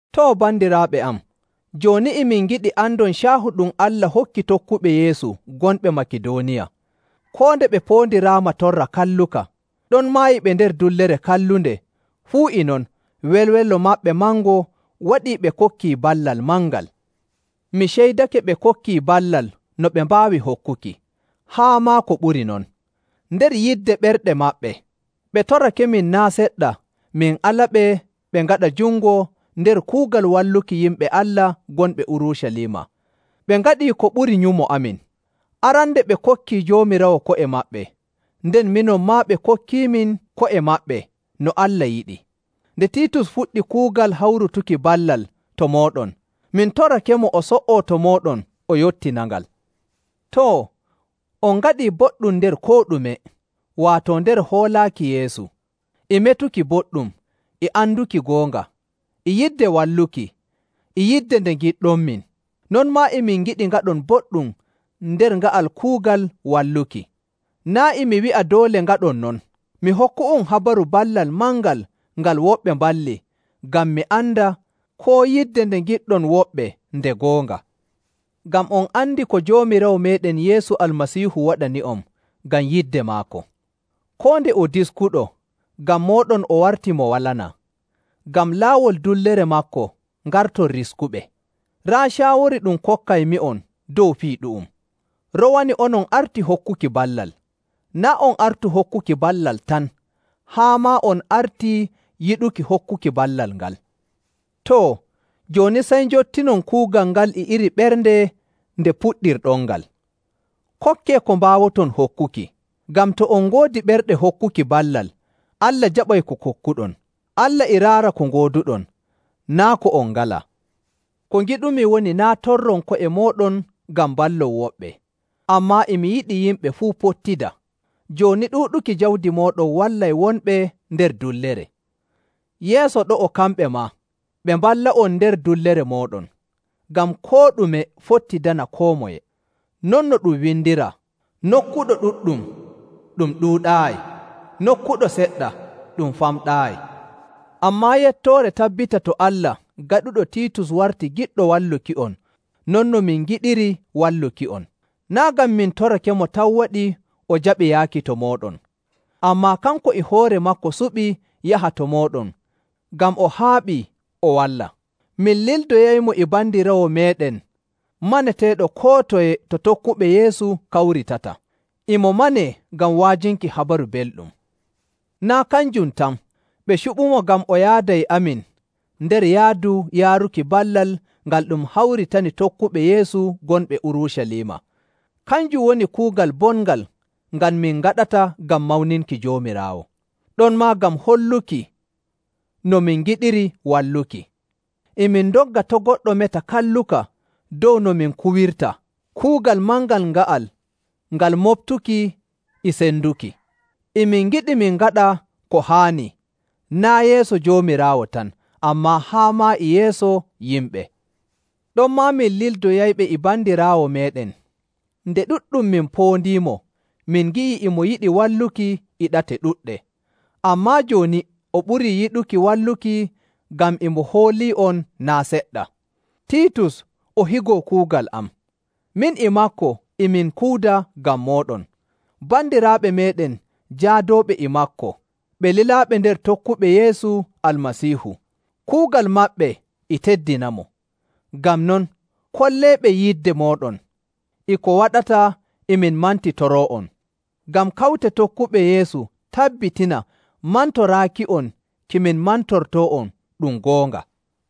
Too, bandiraaɓe am, jooni e min ngiɗi andon caahu ɗum Allah hokki tokkuɓe Yeesu gonɓe Makidooniya. Koo nde ɓe poondiraama torra kalluka, ɗonmaa e ɓe nder dullere kallunde, fuu e non welwelo maɓɓe mango waɗii ɓe kokkii ballal mangal. Mi ceydake ɓe kokkii ballal no ɓe mbaawi hokkuki, haa maa ko ɓuri non. Nder yidde ɓerɗe maɓɓe, ɓe torakemin naa' seɗɗa min alaɓe ɓe ngaɗa jungo nder kuugal walluki yimɓe Allah gonɓe Urucaliima. Ɓe ngaɗii ko ɓuri nyumo amin. Arande ɓe kokkii Joomiraawo ko'e maɓɓe, nden minon maa ɓe kokkiimin ko'e maɓɓe no Allah yiɗi. Nde Tiitus fuɗɗi kuugal hawrutuki ballal to mooɗon, min torakemo o so''oo to mooɗon o yottinangal. Too, on ngaɗii boɗɗum nder koo ɗume, waato nder hoolaaki Yeesu, e metuki boɗɗum, e anduki goonga, e yidde walluki, e yidde nde ngiɗɗonmin. Non maa e min ngiɗi ngaɗon boɗɗum nder nga'al kuugal walluki. Naa' e mi wi'a doole ngaɗɗon non. Mi hokku'on habaru ballal mangal ngal woɓɓe mballi ngam mi anda koo yidde nde ngiɗɗon woɓɓe nde goonga. Ngam on andi ko Joomiraawo meeɗen Yeesu Almasiihu waɗani'on ngam yidde maako. Koo nde o diskuɗo, ngam mooɗon o warti mo walanaa, ngam laawol dullere maako ngarton riskuɓe. Raa caawori ɗum kokkaymi'on dow fii ɗu'um. Rowani onon arti hokkuki ballal, naa' on artu hokkuki ballal tan, haa maa on artii yiɗuki hokkuki ballal ngal. Too, jooni sey njottinon kuugal ngal e iri ɓernde nde puɗɗirɗonngal. Kokkee ko mbaawoton hokkuki. Ngam to on ngoodi ɓerɗe hokkuki ballal, Allah jaɓay ko kokkuɗon. Allah e raara ko ngooduɗon, naa' ko on ngalaa. Ko ngiɗumi woni naa' torron ko'e mooɗon ngam mballon woɓɓe, ammaa e mi yiɗi yimɓe fuu pottida. Jooni ɗuuɗuki jawdi mooɗon wallay wonɓe nder dullere. Yeeso ɗo'o kamɓe maa, ɓe mballa'on nder dullere mooɗon, ngam koo ɗume fottidana koo moye. Non no ɗum windiraa, “Nokkuɗo ɗuɗɗum ɗum ɗuuɗaayi. Nokkuɗo seɗɗa, ɗum famɗaayi.” Ammaa yettoore tabbita to Allah gaɗuɗo Tiitus warti giɗɗo walluki'on non no min ngiɗiri walluki'on. Naa' ngam min torakemo tan waɗi o jaɓi yaaki to mooɗon, ammaa kanko e hoore maako suɓi yaha to mooɗon ngam o haaɓii o walla. Min lildoyaymo e bandiraawo meeɗen maneteeɗo koo toye to tokkuɓe Yeesu kawritata. E mo manee ngam wa'ajinki Habaru Belɗum. Naa' kanjum tan, ɓe cuɓiimo ngam o yaada e amin nder yaadu yaaruki ballal ngal ɗum hawritani tokkuɓe Yeesu gonɓe Urucaliima. Kanjum woni kuugal bongal ngal min ngaɗata ngam mawninki Joomiraawo, ɗonmaa ngam holluki no min ngiɗiri walluki. E min ndogga to' goɗɗo meta kalluka dow no min kuwirta kuugal mangal nga'al ngal moɓtuki e senduki. E min ngiɗi min ngaɗa ko haani, naa' yeeso Joomiraawo tan, ammaa haa maa e yeeso yimɓe. Ɗonmaa min lildoyayɓe e bandiraawo meeɗen, nde ɗuɗɗum min poondiimo min ngi'ii e mo yiɗi walluki e ɗate ɗuɗɗe, ammaa jooni o ɓurii yiɗuki walluki ngam e mo hoolii'on naa' seɗɗa. Tiitus, o higo kuugal am, min e maako e min kuuda ngam mooɗon. Bandiraaɓe meeɗen jaadooɓe e maako, ɓe lilaaɓe nder tokkuɓe Yeesu Almasiihu, kuugal maɓɓe e teddinamo. Ngam non, kolleeɓe yidde mooɗon e ko waɗata e min mantitoroo'on, ngam kawte tokkuɓe Yeesu tabbitina mantoraaki'on ki min mantortoo'on ɗum goonga.